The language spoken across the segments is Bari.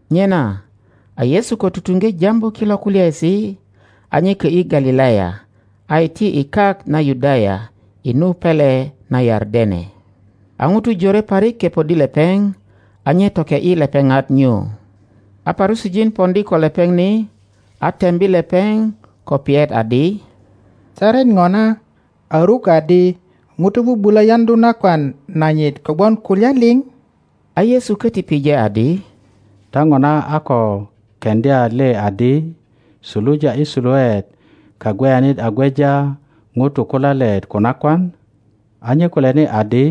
Nyena a Yesu ko tutuŋge jambu kilo kulyaesi, a nye kö ’yi Galilaya, a iti i kak na Yudaya, i nu pele na Yardene. A ŋutu jore parik kepoddi lepeŋ, a nye toke ’yi lepeŋat nyu. A Parusijin poŋdi ko lepeŋ ni a tembi lepeŋ ko piyet adi, Saret ŋona a ruk adi ŋuto bubulö yaŋdu nakwan nanyit kogwon kulya liŋ? A Yesu köti pije adi, Ta ŋona a ko keŋdya le adi, suluja i suluet Kagweyanit a gweja ŋutu ko lalet ko nakwan? a nye kulyani adi,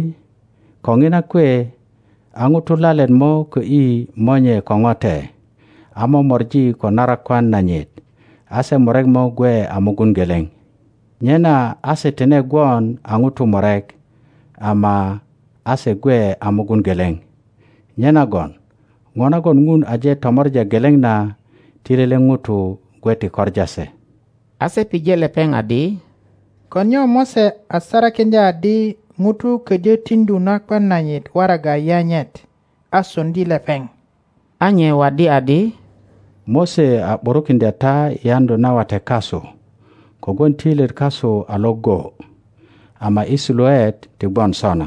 Ko ŋina kwe a ŋuto lalet mo kö ’yi monye ko ŋote, a mo mori ko narakwan nanyit, a se murek mo gwe a mugun geleŋ. Nyena a se tine gwon a ŋutu murek, ama a se gwe a mugun geleŋ. Nyenagon ŋo nagon Ŋun aje tomor a geleŋ na, ti lele ŋuto gwe ti koŋa se. A se pije lepeŋ adi, Ko nyo Mose a sarakiŋdya adi ŋuto ködyö tiŋdu nakwan nanyit waraga yanyet, a soŋdi lepeŋ? A nye waddi adi, Mose a ’burukiŋdya ta i yaŋdu na wate kasu kogwon töilyet kasu a Iŋgo, ama i suluet ti gwon sona.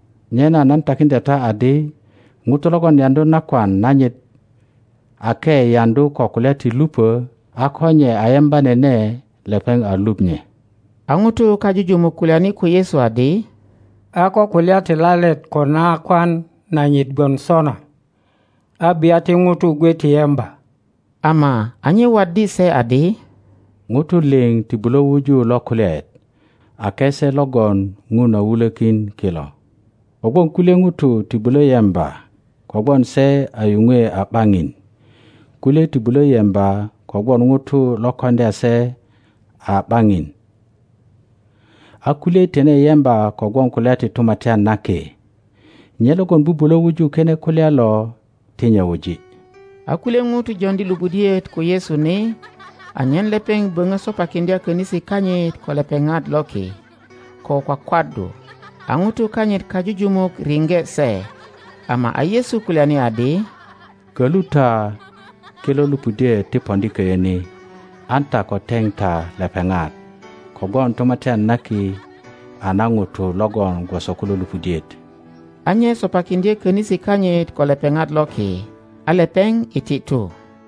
Nyena nan takiŋdya ta adi, ŋuto logon yaŋdu nakwan nanyit, ake yaŋdu ko kulya ti lupö, a ko nye a yemba nene, lepeŋ a luŋ nye. 10A ŋutu kajujumuk kulyani ko Yesu adi, A ko kulya ti lalet ko nakwan nanyit gwon sona, a bia ti ŋutu gwe ti yemba. 11Ama a nye waddi se adi, Ŋutu liŋ ti bulö wuju lo kulyaet, ake se logon Ŋun a wulökin kilo. Kogwon kulye ŋutu ti bulö yemba kogwon se a yuŋwe a ’baŋin, kulye ti bulö yemba kogwon ŋutu lo koŋdya se a ’baŋin, a kulye tine yemba kogwon kulya ti Tumatyan na Ki. Nye logon bubulö wuju kine kulya lo ti nye wuji. A kulye ŋutu joŋdi lupudiet ko Yesu ni anyen lepeŋ böŋö sopakiŋdya könisi kanyit ko lepeŋat loki ko kwakwaddu. A ŋutu kanyit kajujumuk riŋge se. Ama a Yesu kulyani adi, Kölu ta kilo lupudiet ti poŋdi köyö ni, an ta ko teŋ ta lepeŋat; kogwon Tumatyan na Ki a na ŋutu logon gwoso kulo lupudiet. A nye sopakiŋdye könisi kanyit ko lepeŋat loki, a lepeŋ iti tu.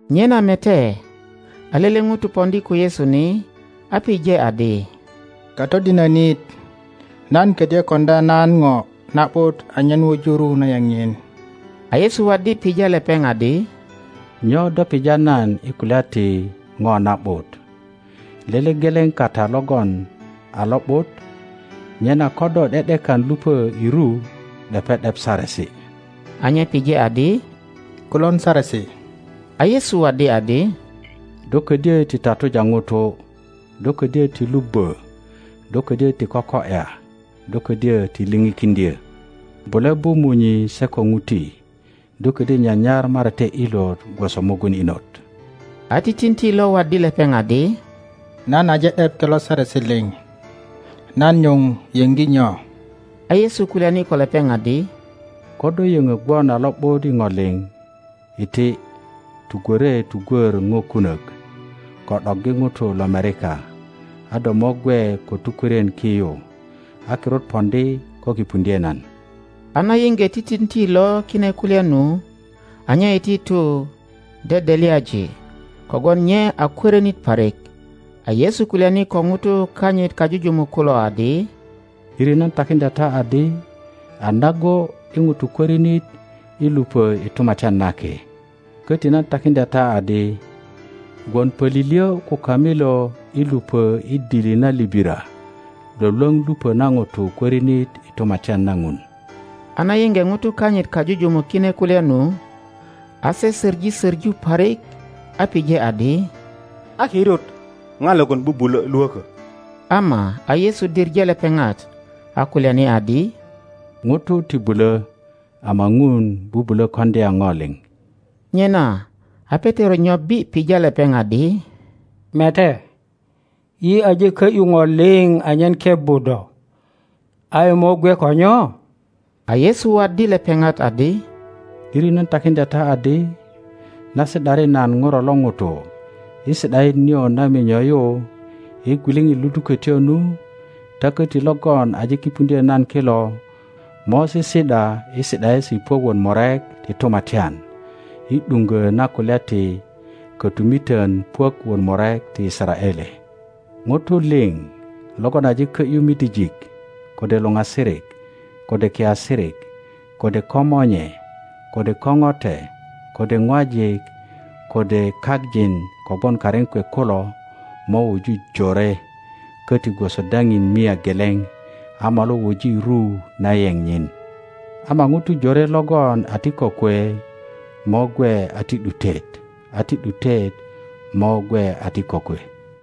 Nyena mete, a lele ŋuto poŋdi ko Yesu ni, a pije adi, Katodinönit, nan ködyö koŋdya nan ŋo na ’but anyen wuju ru na yeŋ nyiŋ? a Yesu waddi pija lepeŋ adi, Nyo do pija nan i kulya ti ŋo na ’but? Lele geleŋ kata logon a lo ’but. Nyena ko do ’de ’dekan lupö i ru, ’depe ’dep saresi. a nye pije adi, Kulon saresi? A Yesu waddi adi, Do ködyö ti tatuja ŋuto; Do ködyö ti lubbö; Do kodyö ti koko ’ya; Do ködyö ti lipikiŋdyö; guje bu munyi se ko ŋuti; Do ködyö nyanyar marate ilot gwoso mugun inot. a titinti lo waddi lepeŋ adi, Nan aje ’dep kilo saresi liŋ; nan nyuŋ yöŋgi nyo? A Yesu kulyani ko lepeŋ adi, Ko do yöŋo gwon a lo ’but i ŋo liŋ, iti, tugwore tugwör ŋo kunök, ko ’doggi ŋutu lomerika, a do mo gwe ko tukwörien ki yu; a kirut poŋdi ko kipuŋdye nan. a na yiŋge titinti lo kine kulya nu, a nye iti tu dedelyaji, kogwon nye a kworinit parik. A Yesu kulyani ko ŋutu kanyit kajujumuk kulo adi, ’Diri nan takiŋdya ta adi, a nago i ŋuto kwörinit i lupö i Tumatyan na Ki. Köti nan takiŋdya ta adi, Gwon pölilyö ko kamilo i lupö i dili na libira lwölwöŋ lupö na ŋuto kwörinit i Tumatyan na Ŋun. a na yiŋge ŋutu kanyit kajujumuk kine kulya nu, a se söŋi söŋu parik a pije adi, A kirut ŋa logon bubulö lwökö? Ama a Yesu diŋe lepeŋat, a kulyani adi, Ŋutu ti bulö, ama Ŋun bubulö koŋdya ŋo liŋ. Nyena a Petero nyobbi pija lepeŋ adi, Mete, yi aje kö ’yu ŋo liŋ anyen kebbu do, a yi mo gwe ko nyo? a Yesu waddi lepeŋat adi, ’Diri nan takiŋdya ta adi, Na si ’dari nan Ŋuro lo ŋuto i si ’daet nio na minyo yu, i gwiliŋit ludukötyo nu, ta köti logon aje kipuŋdyö nan kilo mo sisi ’da i si ’daesi puök wot murek ti tumatyan, i Iŋgö na kulya ti kötumitön puök wot murek ti Yisaraele. Ŋutu liŋ logon aje kö ’yu midijik, kode luŋasirik, kode kiasirik, kode komonye, kode ko ŋote, kode ŋwajik, kode kak jin kogwon karin kwe kulo, mo wuju jore köti gwoso daŋin mia geleŋ, a molu wuji ru na yeŋ nyin. Ama ŋutu jore logon a ti kokwe mo gwe a ti ’dutet, a ti ’dutet mo gwe a ti kokwe.